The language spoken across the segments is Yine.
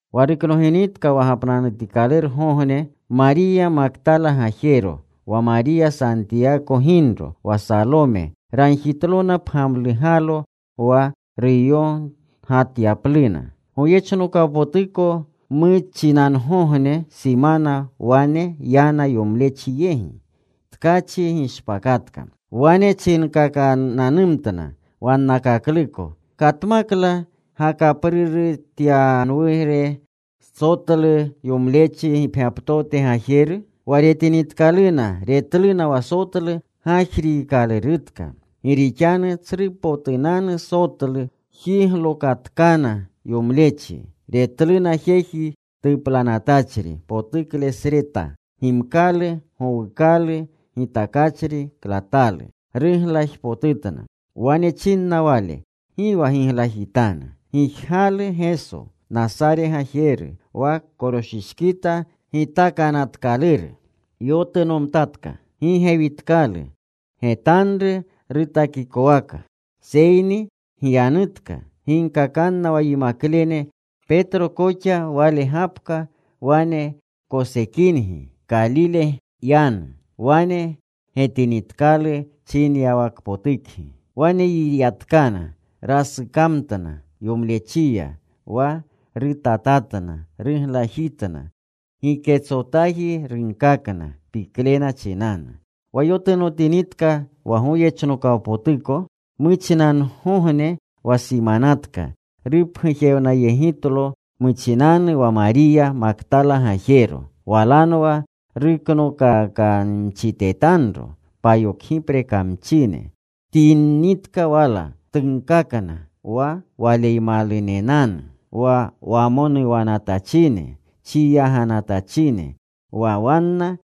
Wa ruknoginitka wa gapnanutikalurgogne, Mariya Maktala gajero, wa Mariya Santiyako ginro, wa Salome, ragjitlona pgamlugalo wa ruyogatyapluna. Goyechnokawpotuko muchinangogne simana wane yana yomlechi yegi. Tkachi gishpakatka. Wane chinkakananumtna wannakakluko, “¿Katmakla gakaprurutyanwure sotlu yomlechi gipgyaptote gajeru?” Wa retinitkaluna, retluna wa sotlu gajritkalurutka. Gi rixanu tsrupotunanu sotlu. Jiglokatkana yomlechi. Retluna jeji tuplanatachri potuklesreta, gimkalu gowukalu gitakachri klatalu. Ruglajpotutna. Wane chinna wale, “Gi wa giglajitanu. Gijgalu Geso, Nasare gajeru, wa koroshishkita gitakanatkaluru. Yotunomtatka. Gi gewitkalu. Getanru rutakikowaka. Seyni gyanutka. Ginkakanna wa yimaklene, Petro koxa, Wale gapka wane kosekingi. Kalile yanu. Wane getinitkalu chinyawakpotukgi.” Wane yiyatkana. Rasukamtna yomlechiya. Wa rutatatna. Ruglajitna. Giketsotaji runkakna, piklena chinanu. Wa yotunotinitka wa goyechnokawpotuko muchinangogne wa simanatka, rupgujewnayegitlo muchinanu wa Mariya Maktala gajero. Walanwa ruknokakamchitetanro payokgipre kamchine. Tyinitka wala. Tunkakna wa Waleymalunenanu, wa wamonuwnanatachine, chiyaganatachine. Wa wanna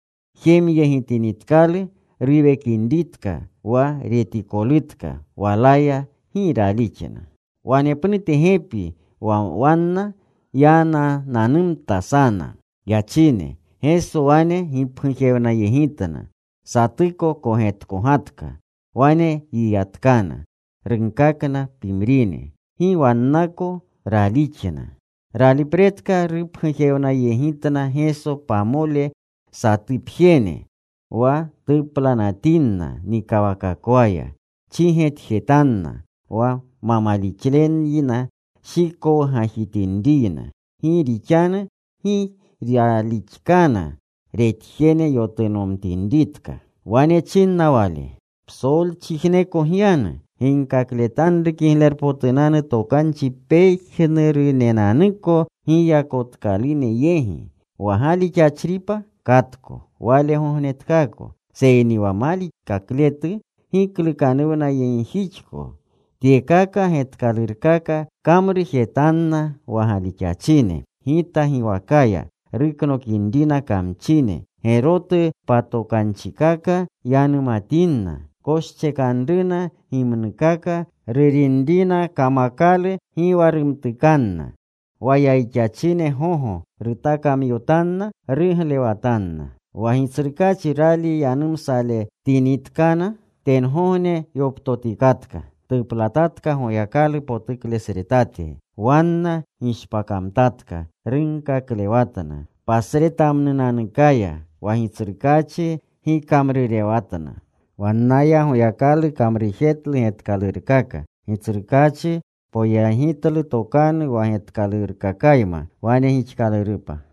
jemyegitinitkalu ruwekinritka, wa retikolutka walaya, gi ralixna. Wanepnute gepi wa wanna yanananumta sana yachine. Geso wane gipgujewnayegitna. Satuko kogetkogatka. Wane yiyatkana. Runkakna pimrine. Gi wannako ralixna. Ralipretka rupgujewnayegitna Geso pamole satupjene wa tuplanatinna nikawakakwaya. Chigetjetanna wa ma malixleyna shikowgajitinriyna, gi rixanu gi ralixkana retjene yotunomtinritka. Wane chinna Wale, “Psolchijneko gyanu. Ginkakletanru Kiglerpotunanu Tokanchi pejnurunenanuko giyakotkalune yegi. Wa galixachripa katko wale gognetkaako, seyni wa malixakletu giklukanuwnayegjixko. Tyekaka getkalurkaka kamrujetanna wa galixachine. Gita giwakaya ruknokinrina kamchine. Gerotu patokanchikaka yanumatinna. Koschekanruna gimnukaka. Rurinrina kamakalu gi wa rumtukanna. Wa yayixachine gogo rutakamyotanna. Ruglewatanna.” Wa Gitsrukaachi gali yanumsayegletinitkana, tengogne yoptotikatka. Tuplatatka Goyakalu potuklesretate. Wanna gishpakamtatka. Runkaklewatna pasretamnunanukaya. Wa Gitsrukaachi gikamrurewatna. Wannaya Goyakalu kamrujetlu getkalurkaka. Gitsrukaachi poyegitlu tokanu wa getkalurkakayma. Wane gixkalurupa.